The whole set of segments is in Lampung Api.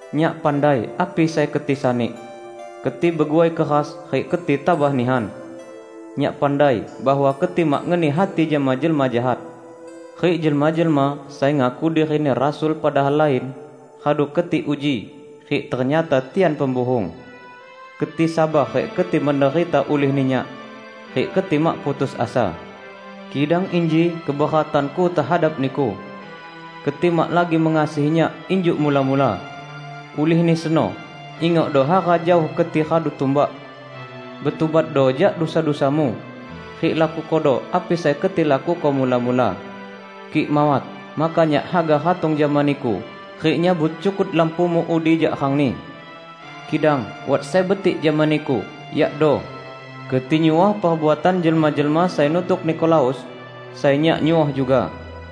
Nyak pandai api sai keti sani: Keti beguai keras rik keti tabah nihan. Nyak pandai bahwa keti mak ngeni hati jama jelma jahat. Rik jelma-jelma sai ngaku dirini rasul padahal lain, radu keti uji, rik ternyata tian pembuhung. Keti sabar rik keti menderita ulihni Nyak, rik keti mak putus asa. Kidang inji keberatan-Ku tehadap niku: Keti mak lagi mengasihi Nyak injuk mula-mula. Ulihni seno, ingokdo hara jaoh keti radu tumbak! Betubatdo jak dusa-dusamu, rik lakukodo api sai keti lakuko mula-mula. Kik mawat, maka Nyak haga ratong jama niku rik nyabut cukut lampumu udi jak rangni. Kidang wat sai betik jama niku, yakdo: Keti nyuoh perbuatan jelma-jelma sai nutuk Nikolaus, sai Nyak nyuoh juga.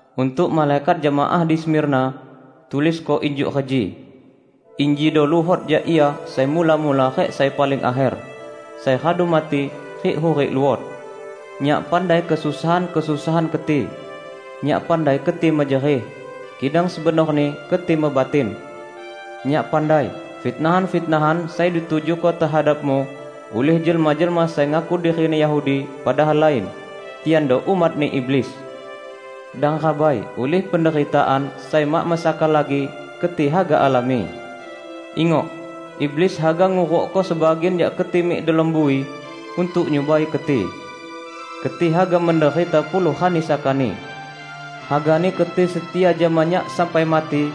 "Untuk malaikat jemaah di Smirna, tulisko injuk reji: Injido luhot jak Ia sai mula-mula rik sai paling akher -- sai radu mati rik hurik luot. Nyak pandai kesusahan-kesusahan keti; Nyak pandai keti mejerih -- kidang sebenorni keti mebatin! Nyak pandai fitnahan-fitnahan sai ditujuko tehadapmu ulih jelma-jelma sai ngaku dirini Yahudi, padahal lain; tiando umatni iblis! Dang rabai ulih penderitaan sai mak mesaka lagi keti haga alami. Ingok, iblis haga ngurukko sebagian jak keti mik delom bui untuk nyubai keti. Keti haga menderita puluh rani sakani. Hagani keti setia jama Nyak sampai mati,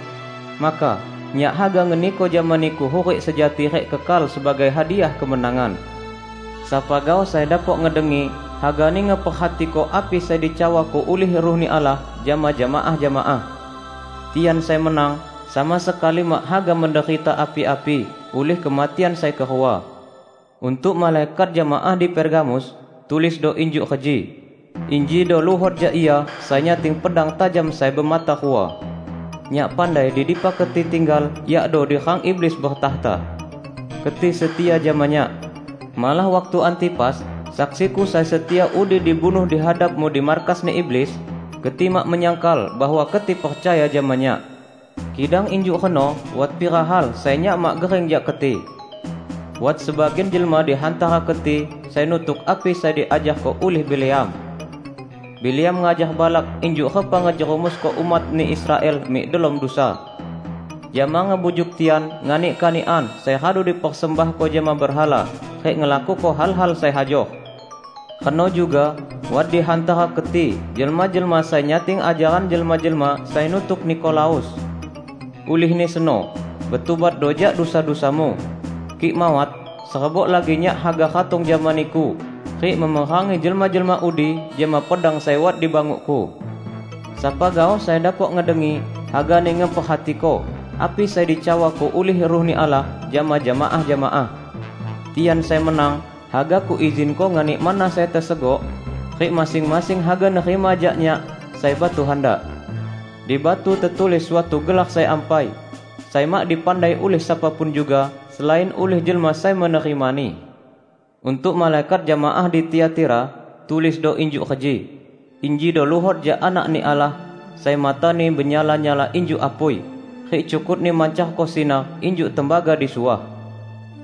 maka Nyak haga ngeniko jama niku hurik sejati rik kekal sebagai hadiah kemenangan. Sapa gaoh sai dapok ngedengi, hagani ngeperhatiko api sai dicawako ulih Ruh-Ni Allah jama jemaah-jemaah! Tian sai menang, sama sekali mak haga menderita api-api ulih kematian sai kerua." "Untuk malaikat jemaah di Pergamus, tulisdo injuk reji: Injido luhot jak Ia sai nyating pedang tajam sai bemata rua. Nyak pandai di dipa keti tinggal, yakdo di rang iblis bertakhta. Keti setia jama Nyak. Malah waktu Antipas, saksi-Ku sai setia udi dibunuh di hadapmu di markasni iblis, keti mak menyangkal bahwa keti percaya jama Nyak. Kidang injuk reno wat pira hal sai Nyak mak gering jak keti: Wat sebagian jelma di hantara keti sai nutuk api sai diajarko ulih Bileam. Bileam ngajar Balak injuk repa ngejerumusko umatni Israel mik delom dusa; jama ngebujuk tian nganik kanikan sai radu dipersembahko jama berhala rik ngelakuko hal-hal sai hajor. Reno juga wat di hantara keti jelma-jelma sai nyating ajaran jelma-jelma sai nutuk Nikolaus. Ulihni seno, betubatdo jak dusa-dusamu! Kik mawat, serebok lagi Nyak haga ratong jama niku rik memerangi jelma-jelma udi jama pedang sai wat di banguk-Ku. Sapa gaoh sai dapok ngedengi, hagani ngeperhatiko api sai dicawako ulih Ruh-Ni Allah jama jemaah-jemaah! Tian sai menang, haga Kuizinko nganik manna sai tesegok, rik masing-masing haga nerima jak Nyak sai batu handak. Di batu tetulis suatu gelar sai ampai, sai mak dipandai ulih sapa pun juga, selain ulih jelma sai menerimani." "Untuk malaikat jemaah di Tiatira, tulisdo injuk reji: Injido luhot jak Anak-Ni Allah, sai mata-Ni benyala-nyala injuk apui, rik cukut-Ni mancarko sinar injuk tembaga disuah.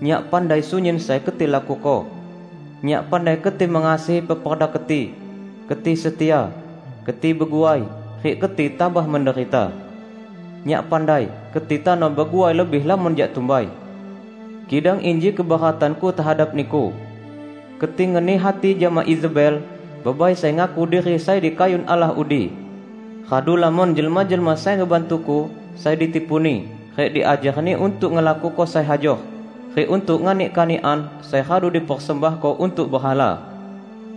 Nyak pandai sunyin sai keti lakuko -- Nyak pandai keti mengasihi peperda keti, keti setia, keti beguai, rik keti tabah menderita. Nyak pandai keti tano beguai lebih lamon jak tumbai. Kidang inji keberatan-Ku tehadap niku: Keti ngeni hati jama Izebel, bebai sai ngaku diri sai dikayun Allah udi. Radu lamon jelma-jelma sai ngebantu-Ku sai ditipuni rik diajarni untuk ngelakuko sai hajor rik untuk nganik kanikan sai radu dipersembahko untuk berhala.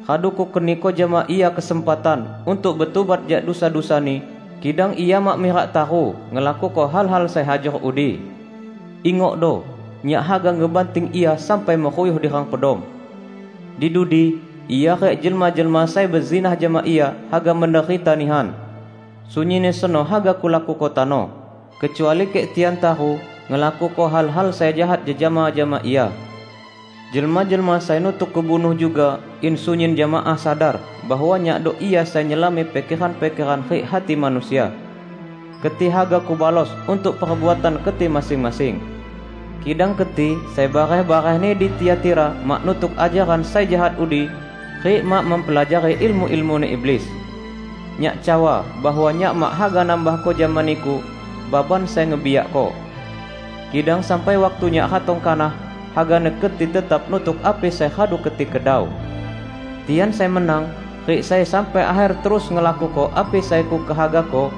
Radu Kukeniko jama ia kesempatan untuk betubat jak dusa-dusani, kidang ia mak mirak taru ngelakuko hal-hal sai hajor udi. Ingokdo! Nyak haga ngebanting ia sampai meruyuh di rang pedom. Di dudi ia rik jelma-jelma sai bezinah jama ia haga menderita nihan. Sunyinni seno haga Kulakuko tano -- kecuali kik tian taru ngelakuko hal-hal sai jahat jejama jama ia. Jelma-jelma sai nutuk Kubunuh juga in sunyin jemaah sadar bahwa Nyakdo Ia sai nyelami pikeran-pikeran rik hati manusia. Keti haga Kubalos untuk perbuatan keti masing-masing. Kidang keti sai bareh-barehni di Tiatira mak nutuk ajaran sai jahat udi, rik mak mempelajari ilmu-ilmuni iblis. Nyak cawa bahwa Nyak mak haga nambahko jama niku baban sai ngebiakko. Kidang sampai waktu Nyak ratong kanah, hagani keti tetap nutuk api sai radu keti kedau. Tian sai menang, rik sai sampai akher terus ngelakuko api sai Kukehagako,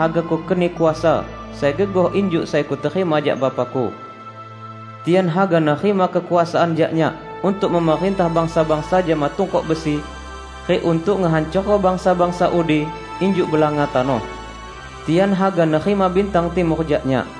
haga Kukeni kuasa sai gegoh injuk sai Kuterima jak Bapa-Ku. Tian haga nerima kekuasaan jak Nyak untuk memerintah bangsa-bangsa jama tungkok besi, rik untuk ngehancorko bangsa-bangsa udi injuk belanga tanoh. Tian haga nerima bintang timur jak Nyak.